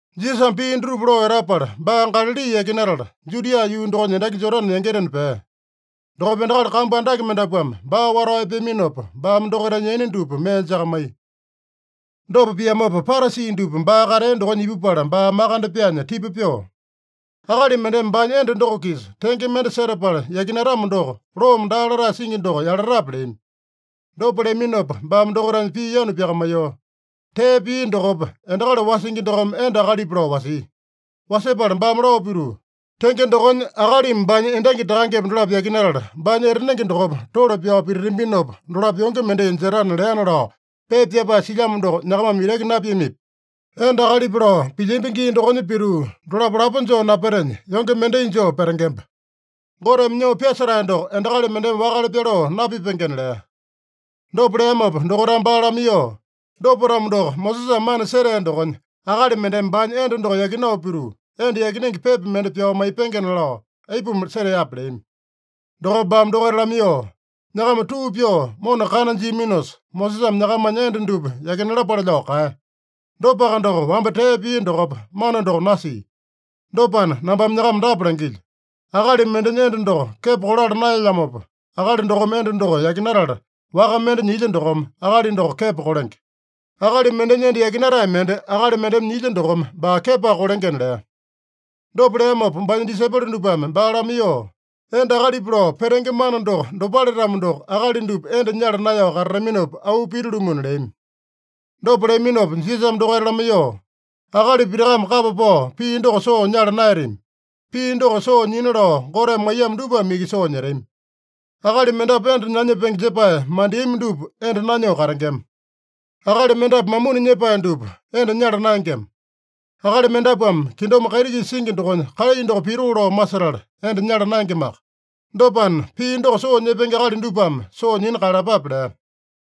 Jisasame pii dutupa lao etapala, baa Galali yakinatala, Judia yuu dokonya endaki Jodane yangitena pea. Dokopa endakali kambu andake mendapuame baa watao epeaminopa, baame dokaitanya yaina dupa mee jakamaiya. Dopa piamopa Parasi dupa baa katea dokonya ipupala baa makande pyaanya tipa pyoo, “Akali mendeme baanya enda doko-kisa tenge mende setapala yakinatamo doko, loome daa latae singi doko yalatape?” leami. Dopa leaminopa baame dokaitanya pii yanu pyakamaiyoo, “Tee pia dokopa, endakali wasingi dokome enda akalipa lao wasia. Wasepala baame lao pituu, ‘Tenge dokonya, akalimi baanya endangi takangepa dolapo yakinatala, baanya etanenge dokopa tole pyao pititambinopa, dolapo yonge mendai jetana’ leana lao pepa pyapae silyamo doko nyakamame itaki napiamipi? Enda akalipa lao pilyambi gii dokonya pituu dolapo lapo joo napetenya, yonge mendai joo petengemba. Goteme nyoo pyasetae doko endakali mendeme wakale pyaloo napipengena” lea. Dopa leamopa dokaitame baa lamaiyoo, “Dopa-tamo doko, Mosesame mana setea dokonya, ‘Akali mendeme baanya enda doko yakinao pituu, enda yakinenge pepa mende pyao maipengena’ lao aipuma seteape?” leami. Dokopa baame dokaita lamaiyoo, “Nyakama tuu pyoo mona kana jiaminosa, Mosesame nyakamanya enda dupa yakinalapale lao kaeya. Dopaka doko, wamba tee pia dokopa, mana doko nasia. Dopana, nambame nyakama dapa langilyo: Akali mendenya enda doko kepo kolala naelyamopa, akali dokome enda doko yakinatala, waka mende nyilya dokome, akali doko kepo kolenge. Akali mendenya enda yakinatae mende akali mendeme nyilya dokome baa kepoaka kolengena” lea. Dopa leamopa baanya disaipolo dupame baa lamaiyoo, “Enda akalipa lao petenge mana doko dopale-tamo doko, akali dupa enda nyala naeyao katataminopa, auu pita-lumuna” leami. Dopa leaminopa Jisasame dokaita lamaiyoo, “Akali pitakame kapa pao pii doko soo nyala naeyatami. Pii doko soo nyina lao Goteme maiyamo dupame iki soo nyetami. Akali mendapu enda nanyepenge jepae mandeami dupa enda nanyoo katengema. Akali mendapu mamuni nyepae dupa enda nyala naengema. Akali mendapuame kingdom kaiti-kisa singi dokonya kalai doko pitoo lao masetala, enda nyala naengemaka. Dopana, pii doko soo nyepenge akali dupame soo nyina kaeyalapape” lea.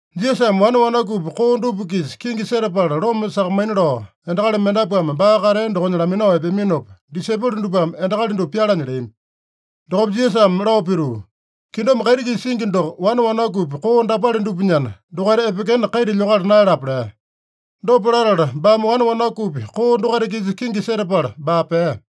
Jisasame wane wanakupi koo dupa-kisa kingi setapala loma sakamaina lao, endakali mendapuame baa katea dokonya laminao epeaminopa, disaipolo dupame endakali dupa pyalanya leami. Dokopa Jisasame lao pituu, “Kingdom kaiti-kisa singi doko wane wanakupi koo dapale dupanyana, dokaita epekena kaita lyokala naeyalapa” lea. Dopa latala baame wane wanakupi koo dokaita-kisa kingi setapala baa pea.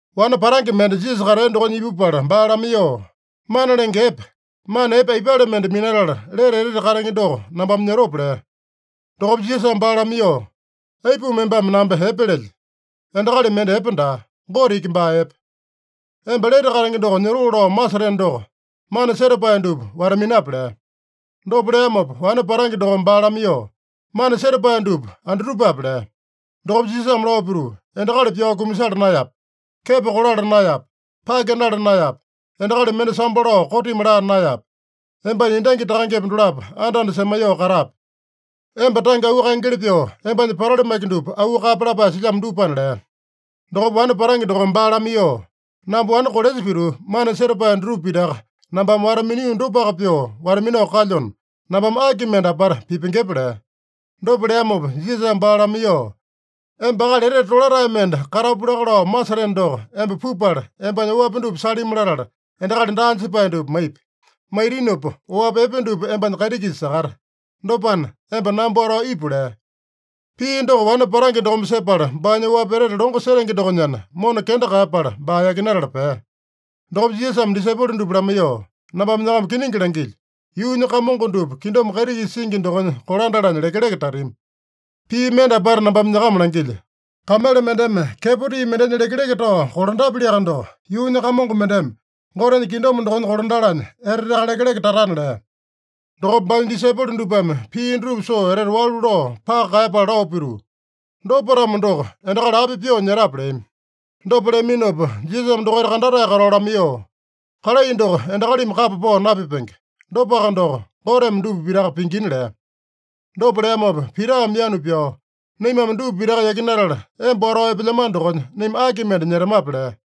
Wane patange mende Jisasa katea dokonya ipupala baa lamaiyoo, “Mana Lenge Epe, mana epe aipale mende minatala, lete etete katenge doko nambame nyotope?” lea. Dokopa Jisasame baa lamaiyoo, “Aipuma embame namba epe lelye? Endakali mende epe daa. Gote iki baa epe. Emba lete katenge doko nyotoo lao maseteno doko, mana setapae dupa wata-minape” lea. Dopa leamopa wane patange dokome baa lamaiyoo, “Mana setapae dupa andutupape?” lea. Dokopa Jisasame lao pituu, “Endakali pyao kumasala naeyape. Kepo kolala naeyape. Pake nala naeyape. Endakali mende sambo lao kotimi laa naeyape. Embanya endangi takangepa dolapo anda-anda semaiyoo katape. Emba tange auu kaengeli pyoo, embanya patali maki dupa auu kaeyape lapae silyamo dupana” lea. Dokopa wane patange dokome baa lamaiyoo, “Namba wane kolesa pituu, mana setapae dutupa pitaka nambame wata-minio dopaka pyoo wata-minao kalyona, nambame aki mende apata pipengepe?” lea. Dopa leamopa Jisasame baa lamaiyoo, “Emba akali etete tolatae mende katapu laka lao maseteno doko, emba pupala, embanya oapi dupa salimi latala, endakali daa jepae dupa maipi. Maitinopa oapi epe dupa embanya kaiti-kisa sakata. Dopana, emba namba watao ipu” lea. Pii doko wane patange dokome sepala, baanya oapi etete longo setenge dokonyana, mona kenda kaeyapala, baa yakinatala pea. Dokopa Jisasame disaipolo dupa lamaiyoo, “Nambame nyakama kiningi langilyo: Yuunya kamongo dupa kingdom kaiti-kisa singi dokonya kolandalanya lekeleke tatami. Pii mende apata nambame nyakama langilyo: Kamele mendeme kepo tii mendenya lekeleke tao kolandapyaliaka doko, yuunya kamongo mendeme Gotenya kingdom dokonya kolandalanya eteteaka lekeleke tatana” lea. Dokopa baanya disaipolo dupame pii dutupa soo etete walu lao paka kaeyapala lao pituu, “Dopa-tamo doko, endakali api pyoo nyetape?” leami. Dopa leaminopa, Jisasame dokaita kandatae katao lamaiyoo, “Kalai doko endakalimi kapa pao napipenge. Dopaka doko, Goteme dupa pitaka pingina” lea. Dopa leamopa Pitame yanu pyao, “Naimame dupa pitaka yakinatala emba watao epelyamano dokonya, naima aki mende nyetamape?” lea.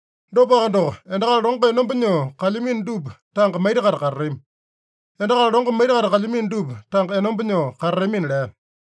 Dopaka doko, endakali longo enomba nyoo kalyamino dupa tanga maita-kaita katatami. Endakali longo maita-kaita kalyamino dupa tanga enomba nyoo katatamina” lea.